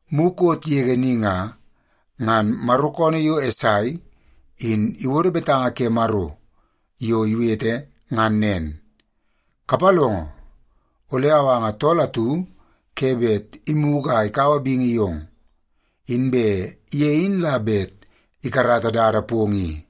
Mukot yege ni nga, ngan Maro koonoo yo Esai in iwodo betanga ke Maro yo iwete ngan nen. “Kapalongo! Ole awanga tool atu ke bet imugu a ikaua bingi yong. Inbe ye in la bet ikarata dada pong i.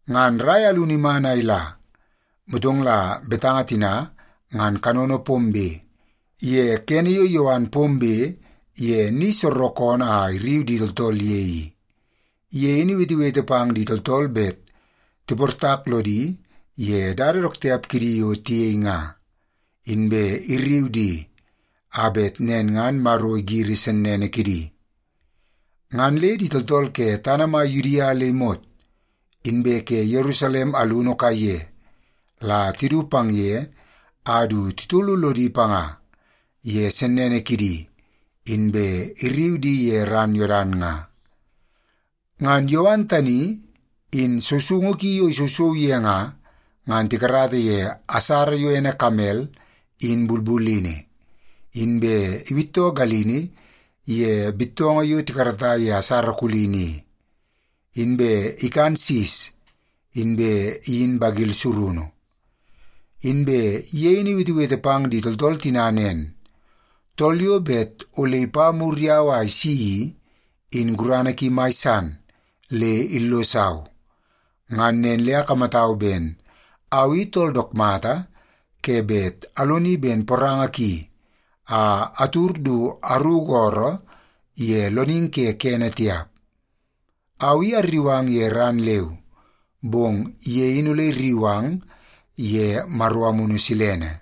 Ngan rai alunu iman a ila, motong la betanga tina ngan kanono pombe ye kene yo Yowan pombe ye ni soorookoonoo a irriu di tooltool ye i. Ye in iwetewete pang di tooltool bet tiportak lodi ye dada dook tiap kidi yo tiyei nga, inbe irriu di a bet nen ngan Maro igiri sennene kidi. Ngan le di tooltool ke tana mai Yudia le imot, inbe ke Yerusalem alunu kaiye la tidu pang ye, a du titulu lodi panga ye sennene kidi, inbe irriu di ye ran Yodan nga. Ngan Yowan tani in sousoungu ki yo isousou ye nga, ngan tikarata ye asara yo ene kamel in bulbulini, inbe iwittoo galini ye bittoongoo yo tikarata ye asara kulini i. Inbe ikan sis, inbe iyin bagil surunu. Inbe ye in iwetewete pang di tooltool tina nen, “Tool yo bet ole ipa mur yau a isi i, in gurana ki mai san le illosau. Ngan nen le akamatau ben au i tool dook mata ke bet aloni ben poranga ki a atur du aruku ooroo ye loningi ke kene tiap. Au i arriu ang ye ran leu, bong ye in ole irriu ang ye Maro Amunu Silene.”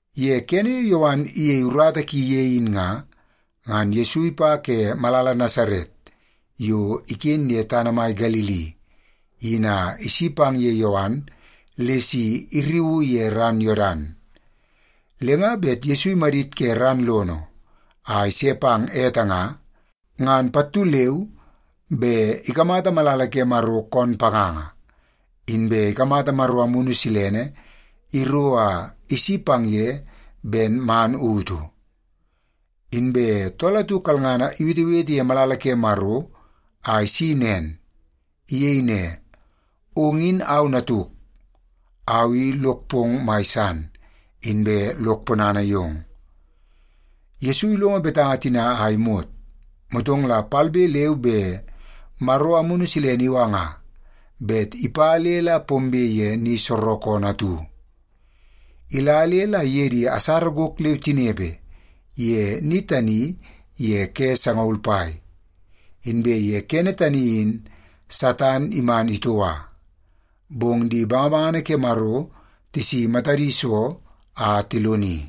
Ye kene yo Yowan iyei urata ki ye in nga, ngan Yesu ipa ke malala Nasaret yo iken ye tana mai Galili in a isi pang ye Yowan le si irriuu ye ran Yodan. Le nga bet Yesu imadit ke ran lono a ise pang ete nga, ngan pattu leu be ikamata malala ke Maro koon panganga, inbe ikamata Maro Amunu Silene iro a isi pang ye ben man utu. Inbe tool atu kalngana iwetewete ye malala ke Maro a isi nen. Iyei ne, “Ong in au Natuk. Au i lok pong mai san, inbe lok ponana yong.” Yesu ilongo betanga tina a imot, motong la palbe leu be Maro Amunu Silene iwanga bet ipa le la pombe ye ni soorookoonoo atu. Ila le la iye di asara gok leu tinepe ye ni tani ye ke sangaul pai, inbe ye kene tani in Satan iman itoua. Bong di bangabangana ke Maro tisi matadi so a tiloni.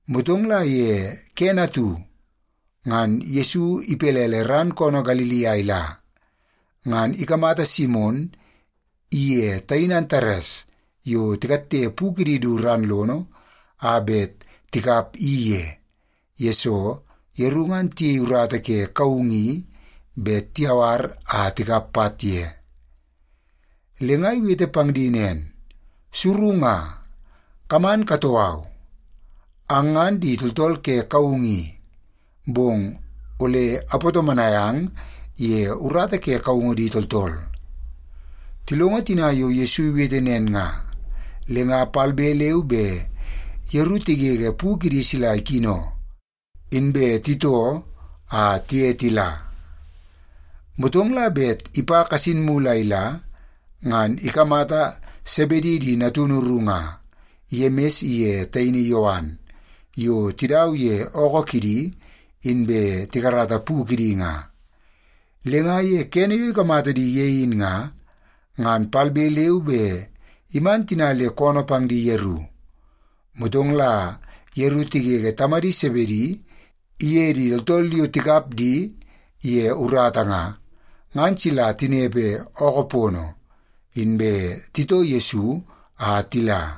Motong la ye kene atu, ngan Yesu ipelele ran koonoo Galili a ila, ngan ikamata Simon iye taini Antares yo tikatte pu kidi du ran lono a bet tikap i ye, yesoo yeru ngan tiyei urata ye kaungu i bet tiyawar a tikap pat ye. Le nga iwete pang di nen, “Suru nga, kaman katoo au. Ang ngan di tooltool ke kaungu i, bong ole apatomonai ang ye urata ke kaungu di tooltool.” Tilongo tina yo Yesu iwete nen nga, le nga palbe leu be yeru tigege pu kidi sila ikino, inbe titoo a tiye tila. Motong la bet ipa kasin mulu a ila, ngan ikamata Sebedi di natunu ru nga, Yemis iye taini Yowan yo tidau ye ookoo kidi inbe tikarata pu kidi nga. Le nga ye kene yo ikamata di ye in nga, ngan palbe leu be iman tina le koonoo pang di yeru. Motong la yeru tigege tamadi Sebedi iye di tooltool yo tikap di ye urata nga, ngan sila tinepe ookoo pono, inbe titoo Yesu a tila.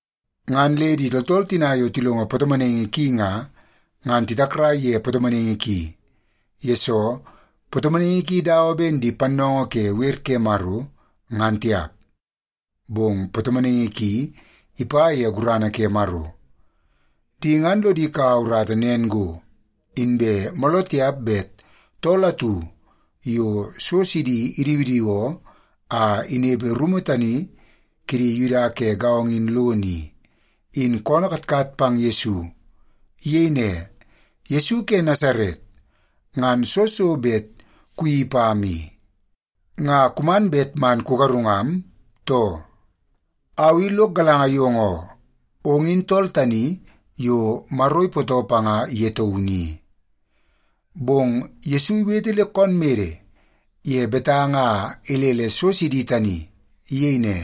Ngan le di tooltool tina yo tilongo patomonaingi ki nga, ngan titakrai ye patomonaingi ki, yesoo patomonaingi ki dawa ben di pannoongoo ke wer ke Maro, ngan tiap, bong patomonaingi ki ipa ye gurana ke Maro. Di ngan lodi kaua urata nen go, inbe mooloo tiap bet tool atu yo so sidi idiwidiwoo a inepe rumu tani kidi Yuda ke gaongo in lono i, in koonoo katkat pang Yesu. Iyei ne, “Yesu ke Nasaret, ngan soo so bet kuyeii pam i? Nga kuman bet man kugarungam, too? Au i lok galanga yong oo, ong in tool tani yo Maro ipootoo panga ye taunu i.” Bong Yesu iwete le koon mede ye betanga a ilele so sidi tani. Iyei ne,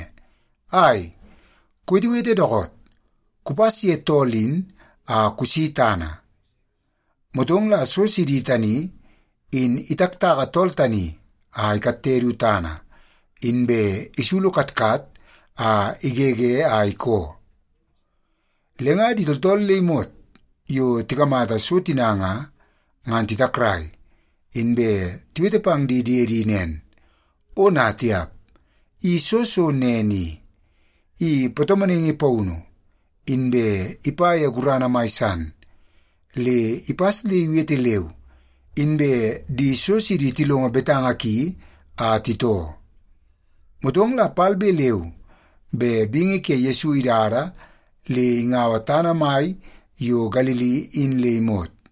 “Ai, kuwetewete dookoot! Kupas ye tool in a kusi tana!” Motong la so sidi tani in itaktaka tool tani a ikatte du tana, inbe isulu katkat a igege a ikoo. Le nga di tooltool le imot yo tikamata so tina nga, ngan titakrai, inbe tiwete pang di diedi nen, “Ona tiap! I soo so nen i? I patomonaingi paunu, inbe ipa ye gurana mai san, le ipas le iwete leu inbe di so sidi tilongo betanga ki a titoo.” Motong la palbe leu be bingi ke Yesu idada le ingaua tana mai yo Galili in le imot.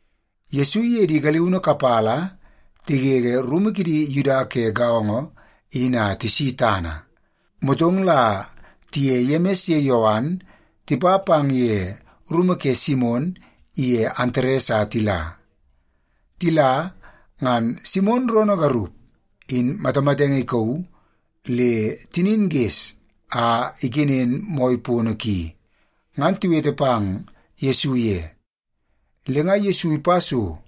Yesu iye di galiunu kapala tigege rumu kidi Yuda ke gaongo in a tisi tana, motong la tiye Yemis ye Yowan tipa pang ye rumu ke Simon iye Antares a tila. Tila, ngan Simon roonoo garup in matamatenge ikauu le tinin ges a ikenen moi pono ki. Ngan tiwete pang Yesu ye. Le nga Yesu ipa so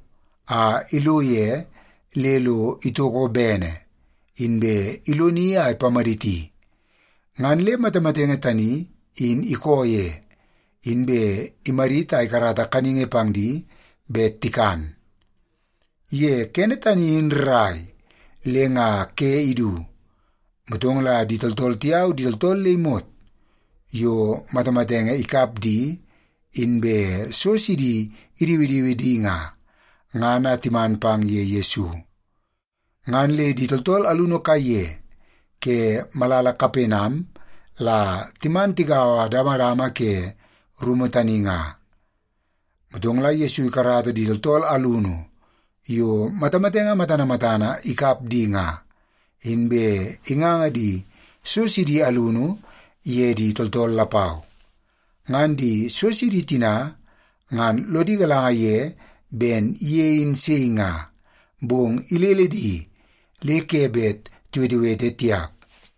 a ilo ye le lo itoko bene, inbe iloni a ipamaditi. Ngan le matamatenge tani in ikoo ye, inbe imadit a ikarata kaningi pang di bet tikan. Ye kene tani in rrai le nga ke idu, motong la di tooltool tiyau di tooltool le imot yo matamatenge ikap di, inbe so sidi idiwidiwi di nga, ngan a timan pang ye Yesu. Ngan le di tooltool alunu kaiye ke malala Kapenam la timan tigaua damadama ke rumu tani nga. Motong la Yesu ikarata di tooltool alunu yo matamatenge matana matana ikap di nga, inbe inganga di so sidi alunu ye di tooltool lapau. Ngan di so sidi tina ngan lodi galanga ye ben ye in sei nga, bong ilele di le ke bet tiwetewete tiap.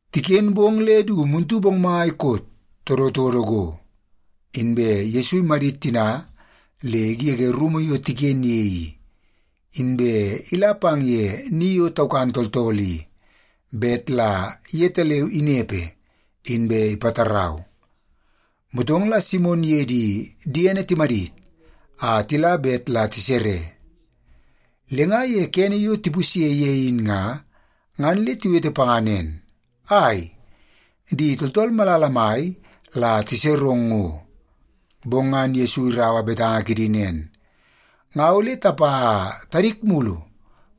Tiken bong le du muntu bongmai koot todotodo go, inbe Yesu imadit tina le igege rumu yo tiken ye i, inbe ila pang ye ni yo taukan tooltool i, bet la yetaleu inepe inbe ipatarau. Motong la Simon iye di diene timadit a tila bet la tisere, le nga ye kene yo tipusye ye in nga, ngan le tiwete panga nen, “Ai, di tooltool malala mai la tiserong ngo.” Bong ngan Yesu iraua betanga kidi nen, “Nga ole tapa a tadik mulu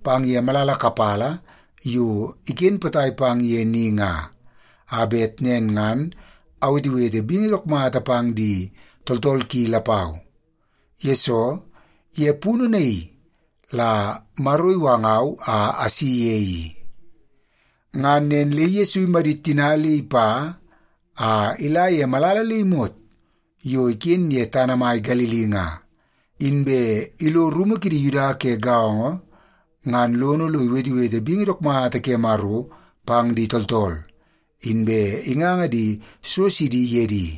pang ye malala kapala yo iken potai pang ye ni nga, a bet nen ngan awetewete bingi dook mata pang di tooltool ki lapau. Yesoo, ye punu naii la Maro iwangau a asi ye i.” Ngan nen le Yesu imadit tina le ipa a ila ye malala le imot yo iken ye tana mai Galili nga, inbe ilo rumu kidi Yuda ke gaongo ngan lono lo iwetewete bingi dook mata ke Maro pang di tooltool, inbe inganga di so sidi ye di.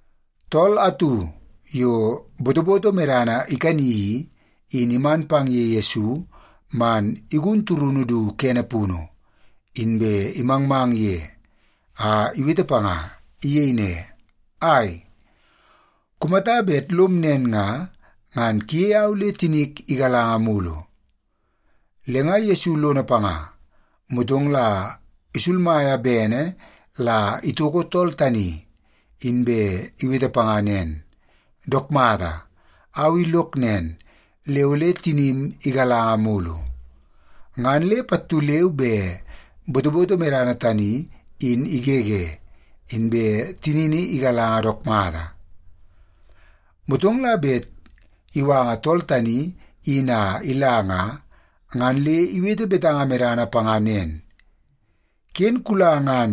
Tool atu yo botoboto medana ikani i, in iman pang ye Yesu man igun turunu du kene punu, inbe imangmang ye a iwete panga. Iyei ne, “Ai, kumata bet lom nen nga, ngan kuyei au le tinik igalanga mulu.” Le nga Yesu lono panga, motong la isulmaia bene la itoko tool tani, inbe iwete panga nen, “Dook mata, au i lok nen, le ole tinim igalanga mulu.” Ngan le pattu leu be botoboto medana tani in igege, inbe tinini igalanga dook mata. Motong la bet iwanga tool tani in a ila nga, ngan le iwete betanga medana panga nen, “Ken kula ngan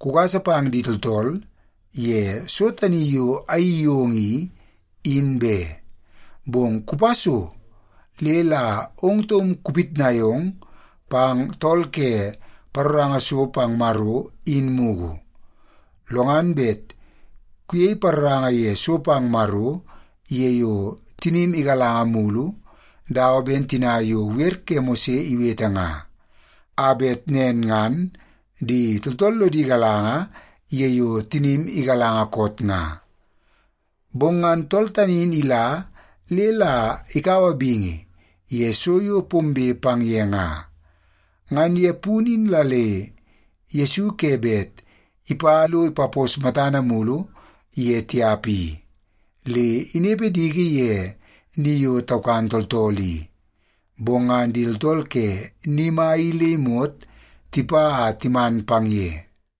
kugasa pang di tooltool ye so tani yo ayeii yong i, in be. Bong kupa so le la ong taum kupitnai ong pang tool ke paroranga so pang Maro in mugu. Lo ngan bet kuyei paroranga ye so pang Maro ye yo tinim igalanga mulu, dawa ben tina yo wer ke Mose iwete nga, a bet nen ngan di tooltool lodi galanga ye yo tinim igalanga koot nga.” Bong ngan tool tani in ila le la ikaua bingi ye so yo pombe pang ye nga. Ngan ye punu in la le Yesu ke bet ipa lo ipapos matana mulu ye tiap i, le inepe diki ye ni yo taukan tooltool i. Bong ngan di tooltool ke ni mai i le imot tipa a timan pang ye.